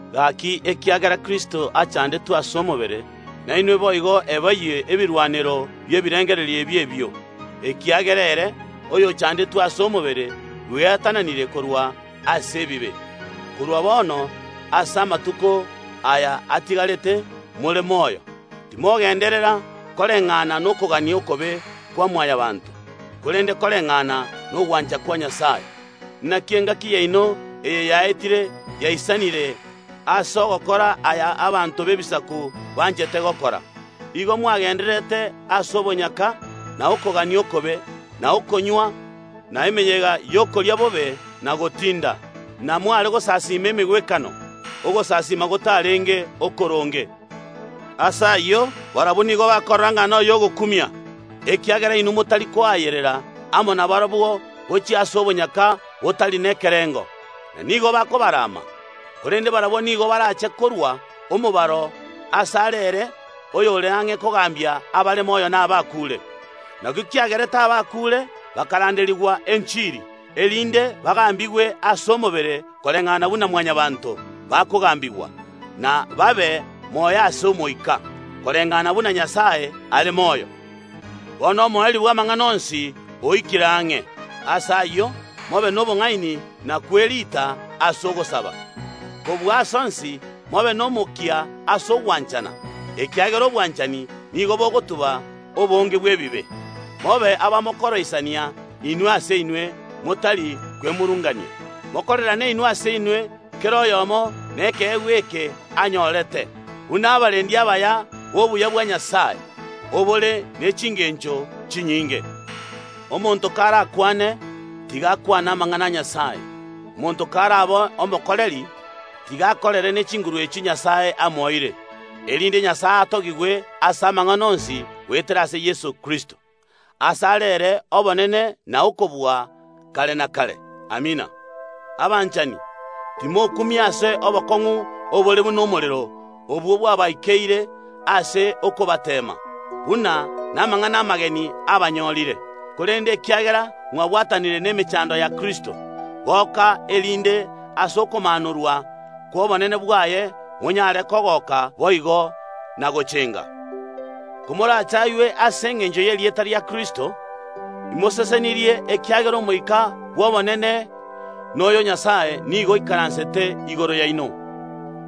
Gaki, ekiagera Kristo achandetwe ase omobere, nainwe boigo eboyie ebirwanero bi’ebirengererio ebio ebio, ekiagera ere oyochandetwe ase omobere bweatananire korwa ase ebibe. Korwa bono ase amatuko aya atigarete more moyo, timogenderera koreng’ana nokogania okobe kwa Mwanyabaanto, korende koreng’ana nogwancha kwa Nyasae. Naki engaki yaino eye yaetire yaisanire ase ogokora aya abanto b’Ebisaku banchete gokora. Igo mwagendererete ase obonyaka, na okogania okobe, na okonywa, na emeyega y’okoria bobe na gotinda, na mware gosasiima emegwekano, ogosasiima gotarenge okoronge. Ase ayio, barabwo nigo bakorora ng’a nay’ogokumia, ekiagera inwe motari koayerera amo nabarabwo gochia ase obonyaka botari nekerengo, na nigo bakobarama. Korende barabwo nigo barache korua omobaro asare ere oyore ang’e kogambia abare moyo na abakuure. Nakio kiagerete abakuure bakaranderigwa enchiri, erinde bagambigwe ase omobere koreng’ana buna Mwanyabaanto bakogambigwa, na babe moyo ase omoika, koreng’ana buna Nyasae are moyo. Bono omoerio bw’amang’ana onsi oikire ang’e. Ase ayio, mobe nobong’aini na kwerita ase ogosaba. Kobua ase onsi mobe nomokia ase ogwanchana, ekiagera obwanchani nigo bogotuba obonge bw’ebibe. Mobe abamokoroisania inwe ase inwe motari kwemurungania. Mokorerane inwe ase inwe, kera oyomo nekeegwa eke anyorete, buna abarendi abaya b’obuya bwa Nyasae, obore ne chingencho chinyinge. Omonto karakwane, tiga akwane amang’ana a Nyasae. Omonto karabe omokoreri, tiga akorere ne chinguru echio Nyasae amoeire, erinde Nyasae atogigwe ase amang’ana onsi goetera ase Yeso Kristo. Asare ere obonene na okobua kare na kare. Amina. Abanchani, timokumia ase obokong’u obore buna omorero, obwo bwabaikeire ase okobateema, buna namang’ana amageni abanyorire. Korende ekiagera mwabwatanire nemechando ya Kristo, goka, erinde ase okomaanorwa kw’obonene bwaye monyare kogoka boigo, na gochenga. Komorachaywe ase engencho y’erieta ria Kristo, imosesenirie ekiagera Omoika bw’obonene noyo o Nyasae nigo oikaransete igoro yaino.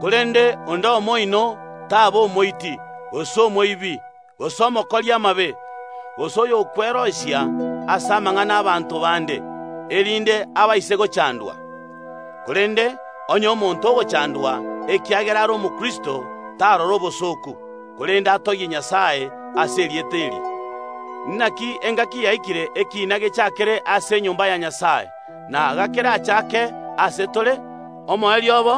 Korende onde omo oino taba omoiti, gose omoibi, gose omokori amabe, gose oyokwerosia ase amang’ana ’abaanto bande, erinde abaise gochandwa. Korende onye omonto ogochandwa ekiagera are Omokristo tarora obosooku, korende atogie Nyasae ase erieta eri. Naki engaki yaikire ekiina gechakere ase enyomba ya Nyasae na gakerachake ase tore, omoerio obo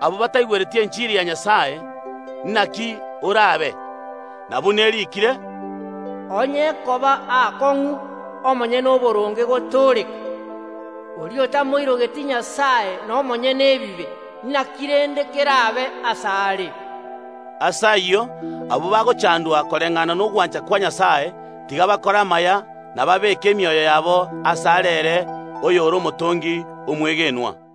abwo bataigwereti enchiri ya Nyasae, naki orabe? Na, buna eriikire, “Onye ekoba aakong’u omonyene oboronge gotooreka, oria otamoirogeti Nyasae na omonyene ebibe, naki rende kerabe asare?” Ase ayio, abwo bagochandwa koreng’ana nogwancha kwa Nyasae, tiga bakore amaya na babeeke emioyo yabo asare ere oyore Omotongi omwegenwa.